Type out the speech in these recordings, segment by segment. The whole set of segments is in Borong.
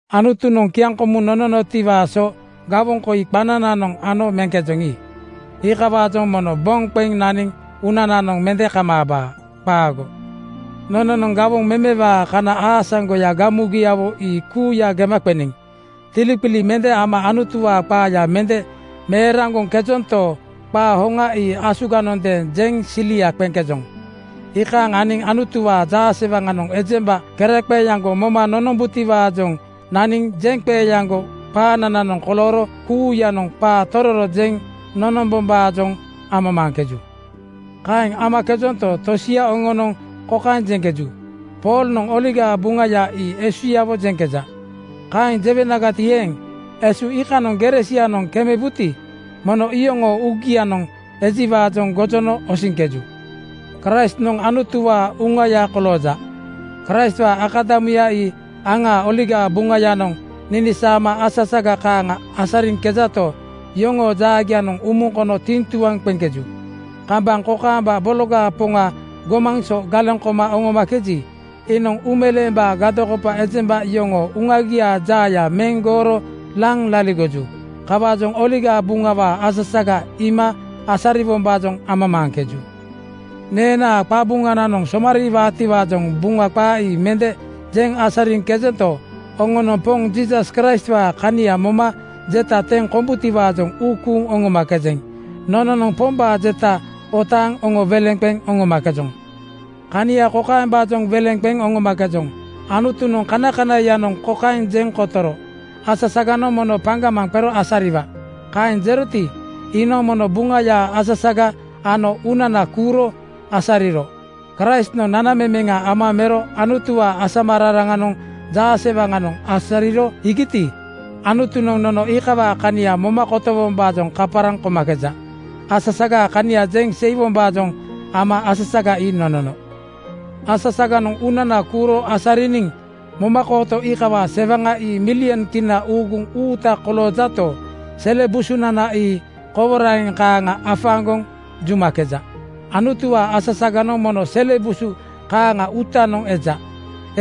Anutunoŋ kiaŋkomuŋ nononotiwaa so gawoŋ koi qanananoŋ ano meŋkejoŋi, iikawaajoŋ mono boŋ qeŋ naniŋ uunananoŋ mende kamaabaa. Qaago! Nononoŋ gawoŋ memewaa kana aasaŋgoya gamugiawo ii kuuya gema qeniŋ. Tiliqili mende ama Anutuwaa qaaya mende meeraŋgoŋkejonto, qaa hoŋa ii asuganondeeŋ jeŋ silia qeŋkejoŋ. Iikaaŋ aniŋ Anutuwaa jaasewaŋanoŋ ejemba keraqeeaŋgo moma nonombutiwaajoŋ naniŋ jeŋqeeaŋgo qaanananoŋ kolooro kuuyanoŋ qaa tororo jeŋ nonombombaajoŋ amamaaŋkeju. Kaeŋ amakejonto, tosia oŋonoŋ kokaeŋ jeŋkeju, “Poolnoŋ Oligaa Buŋaya ii esuyawo jeŋkeja.” Kaeŋ jewenagati eeŋ, esu iikanoŋ gere sianoŋ kemebuti, mono iyoŋoo uugianoŋ ejiwaajoŋ gojono osiŋkeju. Kraistnoŋ Anutuwaa uŋauŋaya kolooja. Kraistwaa akadamuya ii aŋaa Oligaa Buŋayanoŋ ninisaama asasaga kaaŋa asariŋkejato, yoŋoo jaagianoŋ umuŋ kono tiŋtuaŋ qeŋkeju. Kambaŋ kokaamba bologaa Poŋa gomaŋ so galeŋ koma oŋomakeji, iinoŋ uumeleembaa gadokopa ejemba yoŋoo uŋagiaa jaaya meŋ gooro laŋ laligoju. Kawaajoŋ Oligaa Buŋawaa asasaga iima asariwombaajoŋ amamaaŋkeju. Neenaa qabuŋananoŋ somariiwaatiwaajoŋ Buŋa qaa ii mende jeŋ asariŋkejento, oŋonoŋ Poŋ Jiisas Kraistwaa kania moma jeta teŋ kombutiwaajoŋ uu kuuŋ oŋomakejeŋ. Nononoŋ Pombaa jeta otaaŋ oŋo weleŋ qeŋ oŋomakejoŋ. Kania kokaembaajoŋ weleŋ qeŋ oŋomakejoŋ: Anutunoŋ kanakanaiyanoŋ kokaeŋ jeŋ kotoro, “Asasaganoŋ mono paŋgamaŋ qero asariwa.” Kaeŋ jeroti, iinoŋ mono Buŋayaa asasaga ano uunana kuuro asariro. Kraistnoŋ nanamemeŋa ama mero Anutuwaa asamararaŋanoŋ jaasewaŋanoŋ asariro iigiti, Anutunoŋ nono iikawaa kania moma kotowombaajoŋ kaparaŋ komakeja. Asasagaa kania jeŋ seiwombaajoŋ ama asasaga ii nonono. Asasaganoŋ uunana kuuro asariniŋ momakooto iikawaa sewaŋa ii milyon kina uuguŋ uuta koloojato, sele busunana ii koworaŋeŋ kaaŋa afaaŋgoŋ jumakeja. Anutuwaa asasaganoŋ mono sele busu kaaŋaa uutanoŋ eja.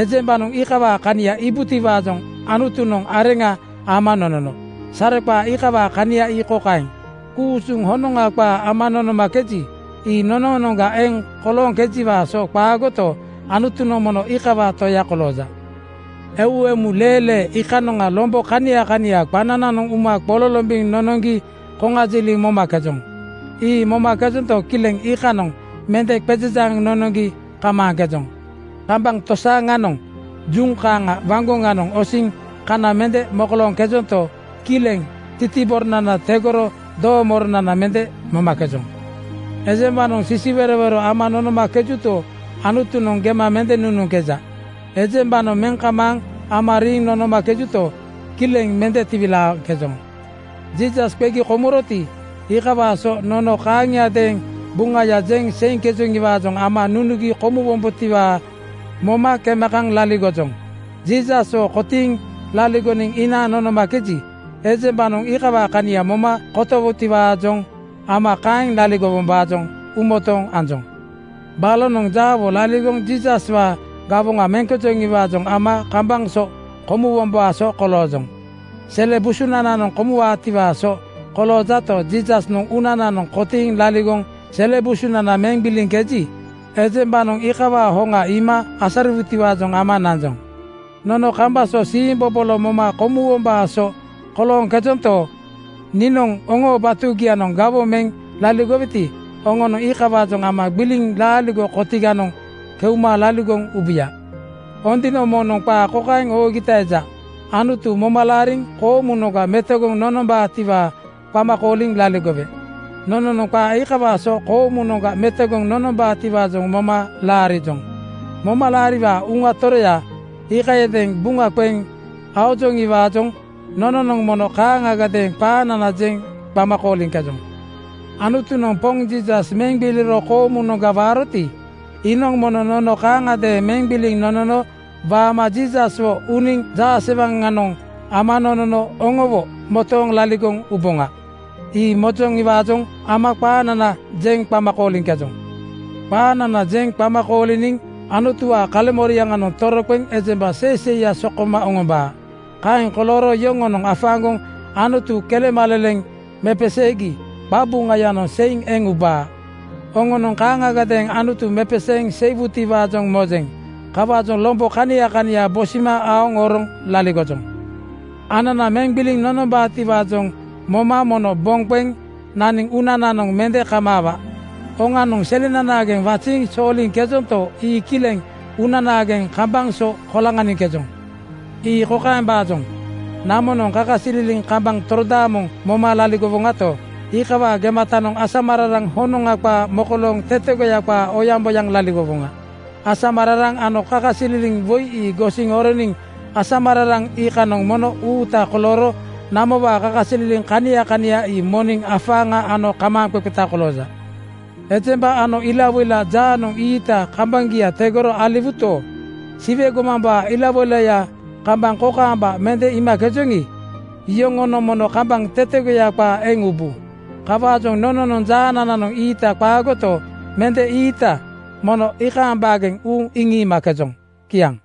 Ejembanoŋ iikawaa kania iibutiwaajoŋ Anutunoŋ areŋa ama nonono. Sareqaa iikawaa kania ii kokaeŋ: ku-usuŋ honoŋa qaa ama nonomakeji, ii nonoonoŋga eeŋ kolooŋkejiwaa so qaagoto, Anutunoŋ mono iikawaa Toya kolooja. Eu emu lee lee iikanoŋa lombo kania kania qanananoŋ uma qololombiŋ nonoŋgi koŋajiliŋ momakejoŋ. Ii momakejonto, kileŋ iikanoŋ mende qezejaaŋ nonoŋgi kamaaŋkejoŋ. Kambaŋ tosaaŋanoŋ juŋ kaaŋa waŋgoŋanoŋ osiŋ kana mende mokolooŋkejonto, kileŋ titiboronana tegoro doomoronana mende momakejoŋ. Ejembanoŋ sisiwerowero ama nonomakejuto, Anutunoŋ gema mende nunuŋkeja. Ejembanoŋ meŋ kamaaŋ ama riiŋ nonomakejuto, kileŋ mende tiwilaaŋkejoŋ. Jiisas qegi komuroti, iikawaa so nono kaaŋiadeeŋ buŋaya jeŋ seiŋkejoŋiwaajoŋ ama nunugi komuwombotiwaa moma kema kaŋ laligojoŋ. Jiisaswo kotiiŋ laligoniŋ inaaŋ nonomakeji, ejembanoŋ iikawaa kania moma kotowutiwaajoŋ ama kaeŋ laligowombaajoŋ uumotooŋ anjoŋ. Balonoŋ jaawo laligoŋ Jiisaswaa gawoŋa meŋkejoŋiwaajoŋ ama kambaŋ so komuwombaa so koloojoŋ. Sele busunananoŋ komuwaatiwaa so koloojato, Jiisasnoŋ uunananoŋ kotiiŋ laligoŋ sele busunana meŋ gbiliŋkeji, ejembanoŋ iikawaa hoŋa iima asariwutiwaajoŋ ama nanjoŋ. Nono kambaŋ so siimbobolo moma komuwombaa so kolooŋkejonto, niinoŋ oŋoo batugianoŋ gawoŋ meŋ laligoweti, oŋonoŋ iikawaajoŋ ama gbiliŋ laaligo kotiganoŋ keuma laligoŋ ubuya. Ondino (Buk Song) moŋnoŋ qaa kokaeŋ oogita eja, “Anutu moma laariŋ koomunoŋga metogoŋ nombaatiwaa qama kooliŋ laligowe.” Nononoŋ qaa iikawaa so koomunoŋga metogoŋ nonombaatiwaajoŋ moma laarijoŋ. Momalaariwaa Uŋa Toroya iikayadeeŋ buŋa qeŋ aojoŋiwaajoŋ nononoŋ mono kaaŋagadeeŋ qaanana jeŋ qama kooliŋkejoŋ. Anutunoŋ Poŋ Jiisas meŋ gbiliro koomunoŋga waaroti, iinoŋ mono nono kaaŋagadeeŋ meŋ gbiliŋ nonono waama Jiisaswo uniŋ jaasewaŋanoŋ ama nonono oŋowo motooŋ laligoŋ uboŋa. Ii mojoŋiwaajoŋ ama qaanana jeŋ qama kooliŋkejoŋ. Qaanana jeŋ qama kooliniŋ Anutuwaa kaleŋmoriaŋanoŋ toroqeŋ ejemba seiseiya sokoma oŋombaa. Kaeŋ kolooro yoŋonoŋ afaaŋgoŋ Anutu kelemaleleŋ mepeseegi qaqabuŋayanoŋ seiŋ eŋ ubaa. Oŋonoŋ kaaŋagadeeŋ Anutu mepeseeŋ seiwutiwaajoŋ mojeŋ. Kawaajoŋ lombo kania kania bosima aoŋ oroŋ laligojoŋ. Anana meŋ gbiliŋ nonombaatiwaajoŋ moma mono boŋ qeŋ naniŋ uunananoŋ mende kamaawa. Oŋanoŋ selenanaageŋ waziiŋ sooliŋkejonto, ii kileŋ uunanaageŋ kambaŋ so koloŋaniŋkejoŋ. Ii kokaembaajoŋ: Namonoŋ kakasililiŋ kambaŋ torodaamoŋ moma laligowoŋato, iikawaa gematanoŋ asamararaŋ honoŋa qaa mokolooŋ tetegoya qaa oyaŋboyaŋ laligowoŋa. Asamararaŋ ano kakasililiŋ woi ii gosiŋ oroniŋ asamararaŋ iikanoŋ mono uuta kolooro namowaa kakasililiŋ kania kania ii moniŋ afaaŋa ano kamaaŋqeqeta kolooja. Ejemba ano ilawoila jaanoŋ ii-iita ii kambaŋgia tegoro aliwuto, Siwe gomambaa ilawoilaya kambaŋ kokaamba mende iimakejoŋi, iyoŋonoŋ mono kambaŋ tetegoya qaa eŋ ubu. Kawaajoŋ nononoŋ jaanananoŋ ii-iita ii qaagoto, mende ii-iita mono iikaaŋ baageŋ uuŋ iŋiimakejoŋ. Kiaŋ.